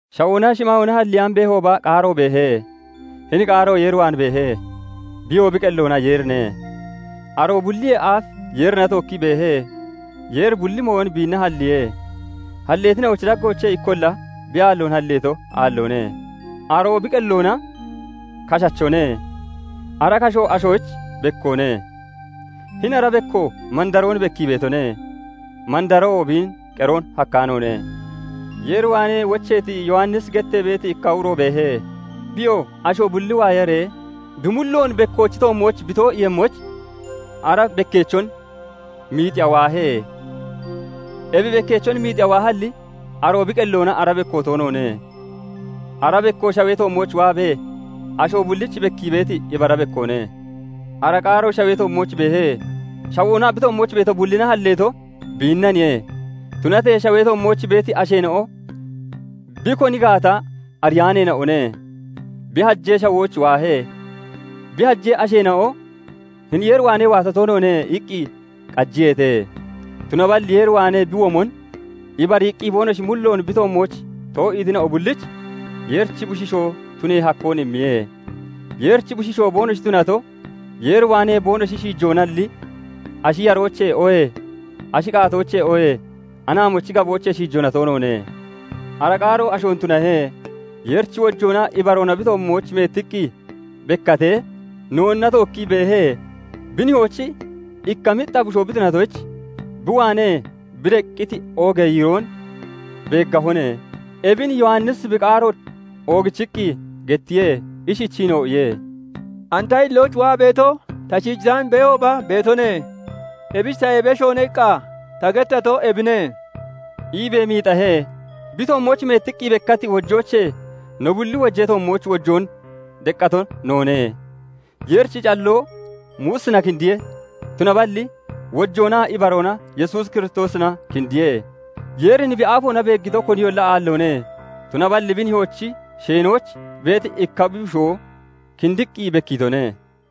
Shawoonaa shimaayoona halleyaan beehooba, Qaaro beehe; hini Qaaro Yeer waan beehe; biyoo bi qelloona Yeerine. Aroo bulliyee aaf Yeerina tookkii beehe. Yeeri bulli mooyon biinna halliihe; halleetina'ochi daggoochee ikkolla bi aalloon halleeto aalloone. Aroo bi qelloona kashachone; ara kasho ashoyich bekkoone. Hini ara bekko mandaroon bekkii beetone; mandaroo biin qeroon hakkaanoone. Yeer waanee wocheeti, Yowannisi gettee beeti ikka uro beehe. Biyoo asho bulli waayaree bi mulloon bekkoochi toommooch bi too'iiyemmoyich, ara bekkeechon miixiya waahe. Ebi bekkeechon miixiya waahalli, aroo bi qelloona ara bekko toonoone. Ara bekko shawee toommooch waabee, asho bullich bekkii beeti ibara bekkoone. Ara Qaaro shawee toommooch beehe; shawoonaa bi toommooch beeto bullina halleeto biinnaniye; tunatee shawee toommooch beeti asheena'o bi koni gaata ariyaaneena'one. Bi hajee shawooch waahe; bi hajee asheena'o "Hini Yeer waanee waato toonoone" iqqi qajiyeete. Tunaballi Yeer waanee bi womon ibariiqqi boonoshi mulloon bi toommooch too'iitina'o bullich Yeerichi Bushiishoo tunee hakkoon immiye. Yeerichi Bushiishoo boonoshi tunato, Yeer waanee boonoshi shiijoonalli, ashi yarooche, oohee ashi qaatooche, oohee anaamochi gaboochee shiijoona toonoone. Ara Qaaro ashoon tunahe; Yeerichi wojoonaa ibaroona bi toommooch meettiqqi bekkaatee noonna tookkii beehe; bi Nihoyich ikka mixxa Bushoo bi tunatoyich, bi waanee bi deqqiti oogee yiiroon beeggahone. Ebin Yowannisi bi qaaroon oogichiqqi gettiye; ishichiinoo iye:- " 'And ta hillooch waa beeto, ta shiijataan beehooba beetone; ebich tayee beshoone' iqqa ta gettato ebine" iibee miixahe. Bi toommooch meettiqqi bekkati wojoochee no bulli wojee toommooch wojoon deqqato noone. Yeerichi calloo Muusina kindiye; tunaballi wojoonaa ibaroona Yesuus Kiristoosina kindiye. Yeerin bi aafoona beeggito koniyolla aalloone; tunaballi bi Nihoochi sheenooch beeti ikka bi Bushoo kindiqqi bekkiitone.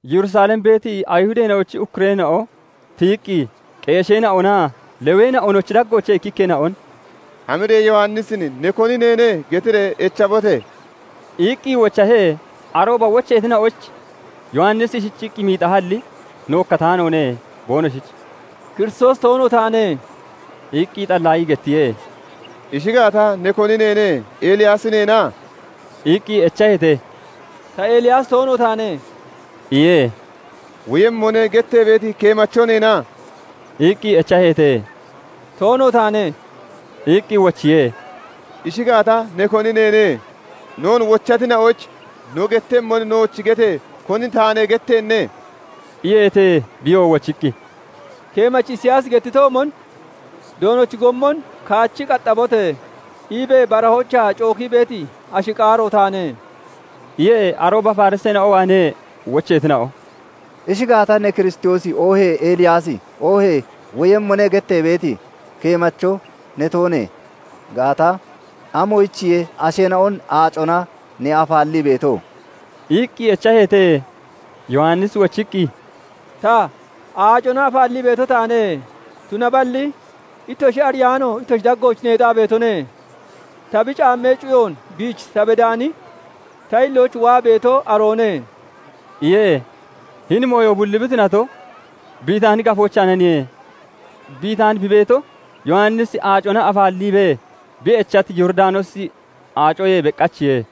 Yerusalem beeti Ayihudeena'ochi ukkureena'o tiyiqqi qeesheena'onaa Leweena'onochi daggoochee ikkikkeena'on "Hamiree Yowannisin 'Ne koni neene?' getiree echabote!" iqqi wochaheete. Arooba wocheetina'oyich Yowannisi ishichiqqi miixahalli, nookkataanoone; boonoshich "Kiristoosi toono taane" iqqi xallaayii gettiye. "Ishi gaata, ne koni neene? Eliyaasi neena?" iqqi echaheete. "Ta Eliyaasi toono taane" iye. " 'Woyemmone' gettee beeti keemacho neena?" iqqi echaheete. "Toono taane" iqqi wochiye. "Ishi gaata, ne koni neene? Noon wochatina'oyich no gettemmon nooch gete! Koni taane gettenne?" iyeete. Biyoo wochiqqi, "Keemachi Isiyaasi gettitoomon ' "Doonochi gommon kaachi qaxxabote!" iibee barahoochaa cookii beeti ashi qaaro' taane" iye. Arooba Fariseena'o waanee wocheetina'o " Ishi gaata, ne Kiristoosi, oohee Eliyaasi, oohee 'Woyemmone' gettee beeti keemacho ne toonee gaata, amoyichiye asheena'on aacona ne afaallii beeto?" iqqi echaheete. Yowannisi wochiqqi, "Ta, aacona afaallii beeto taane; tunaballi ittoshi ariyaano ittoshi daggooch neexaa beetone; Ta bi caammee cuyoon biich ta bedaani, ta hillooch waa beeto aroone" iye. Hini mooyo bulli bi tunato, Bitaani gafoochaananiye; Bitaani bi beeto, Yowanisi aacona afaalliibee bi echati Yooridanoosi Aacoyee beqachiye.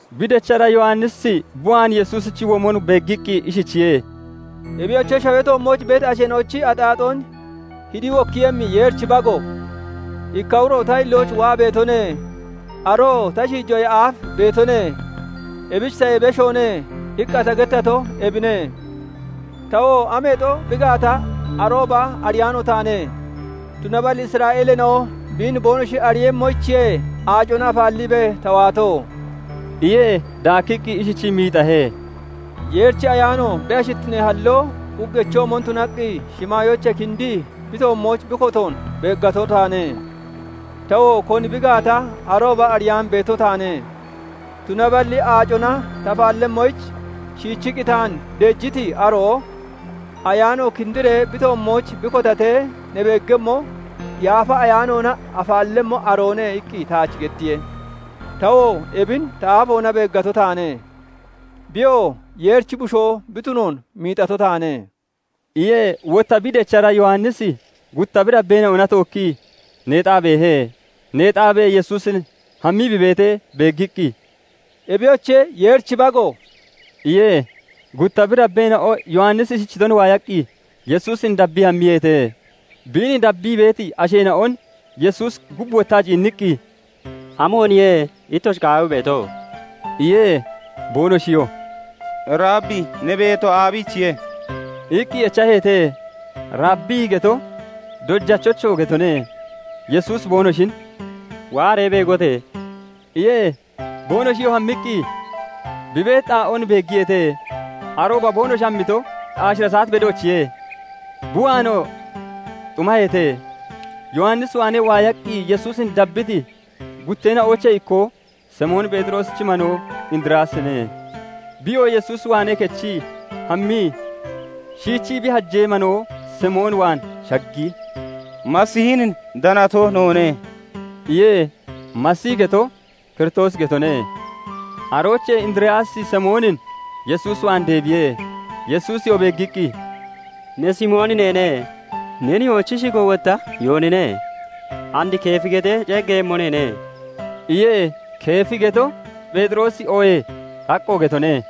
Bi dechara Yowannisi bi waan Yesuusichi womon beeggiqqi ishichiye:- "Ebiyoche, shawee toommooch beeti asheena'ochi axaaxoon hidi wokkiiyemmi Yeerichi Bago! 'Ikka uro ta hillooch waa beetone; aroo ta shiijoyee aaf beetone; ebich tayee beshoone' iqqa ta gettato ebine. Tawo ameexo bi gaata arooba ariyaano taane; tunaballi Isra'eeleena'o biin boonoshi ariiyemmoyichiye aacona afaalliibee ta waato" iye. Daakkiqqi ishichii miixahe:- "Yeerichi Ayaano bi ashittinee halloo uggechoomon tunaqqi shimaayoochee kindii bi toommooch bi kotoon beeggato taane. Tawoo koni bi gaata arooba ariyaan beeto taane; tunaballi aacona ta afaallemmoyich shiichiqqi taan deejiti aroo 'Ayaano kindiree bi toommooch bi kotatee ne beeggemmo, Yaafa Ayaanoona afaallemmo aroone' iqqi taach gettiye. tawoo ebin ta aafoona beeggato taane; biyoo Yeerichi Bushoo bi tunoon miixato taane" iye. Wotta bi dechara Yowannisi gutta bi dabbeena'ona tookkii neexaa beehe. Neexaabee, Yesuusin hammii bi beetee beeggiqqi, "Ebiyoche! Yeerichi Bago!" iye. Gutta bi dabbeena'o Yowannisi ishichoon waayaqqi Yesuusin dabbii hammiyeete. Biin dabbii beeti asheena'on Yesuusi gub wottaa ciinniqqi, "Amooniye ittoshi qaawii beeto?" iye. Boonoshiyoo "Rabbi! Ne beeto aabiichiye?" iqqi echaheete. "Rabbi!" geto "Dojachocho!" getone. Yesuusi boonoshin "Waaree beegote!" iye. Boonoshiyoo hammiqqi bi beeti xaa'oon beeggiyeete. Arooba boonoshi hammito aashira saat bedoochiye. Bi waanoo xumaheete. Yowannis waanee waayaqqi Yesuusin dabbiti gutteena'oochee ikkoo Simoon Pheexiroosichi manoo Indiriyaasine. Biyoo Yesuus waanee kechii hammii shiichii bi hajee manoo Simoon waan shaggii, "Masiihin danato noone" iye. "Masiihi" geto "Kiristoosi" getone. Aroochee Indiriyaasi Simoonin Yesuus waan deebiye. Yesuusiyoo beeggiqqi, "Ne Simooni neene; ne nihoochi shigo wotta Yoonine; and Keefi getee ceeggeeyemmo neene" iye. "Keefi" geto "Pheexiroosi" oohee "Xaqqo" getone.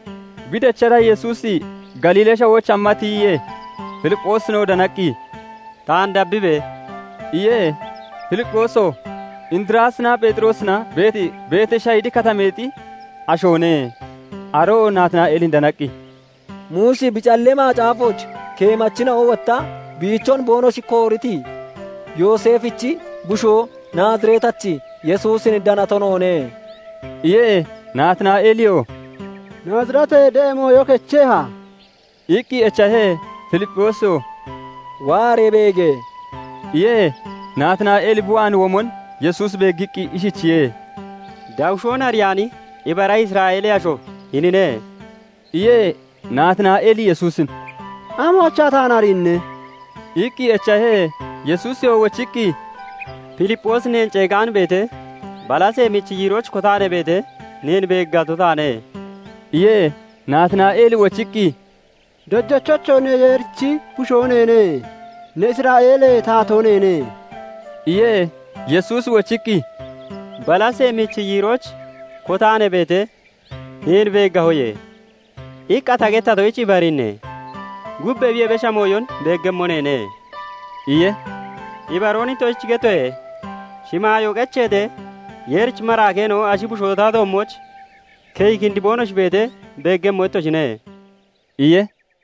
Bi dechara Yesuusi Galiilee Shawooch hamma tiyiye; Filipphoosinoo danaqqi, "Taan dabbibe!" iye. Filipphoosiyoo Indiriyaasinaa Pheexiroosina beeti Beteshayidi Katameexi ashoone. Aroo Naatinaa'eelin danaqqi, "Muusi bi callee Macaafooch, keemachina'o wotta biichon boonoshi kooriti Yooseefichi bushoo, Naazireetachi Yesuusin danato noone" iye. Naatinaa'eeliyoo "Naazireetee de'a mooyo kecheha?" iqqi echahe. Filipphoosiyoo "Waaree beege!" iye. Naatinaa'eeli bi waan womon Yesuusi beeggiqqi ishichiye:- "Dawushoon ariyaani ibara Isra'eelee asho hinine" iye. Naatinaa'eeli Yesuusin "Amoochaa taan ariinne?" iqqi echahe. Yesuusiyoo wochiqqi, "Filipphoosi neen ceegaan beetee, balasee michi yiirooch kotaa ne beetee, neen beeggato taane" iye. Naatinaa'eeli wochiqqi, "Dojachocho! Ne Yeerichi Bushoo neene; ne Isra'eelee Taatoo neene" iye. Yesuusi wochiqqi, " 'Balasee michi yiirooch kotaa ne beetee, neen beeggahoye' iqqa ta gettatoyich ibariinne? Gub ebiyee besha mooyon beeggemmo neene" iye. "Ibaroon ittoshich gettoye:- Shimaayoo qecheetee, Yeerichi maraakeena'o Ashi Bushoo ta toommooch keyi kindi boonoshi beetee, beeggemmo ittoshine" iye.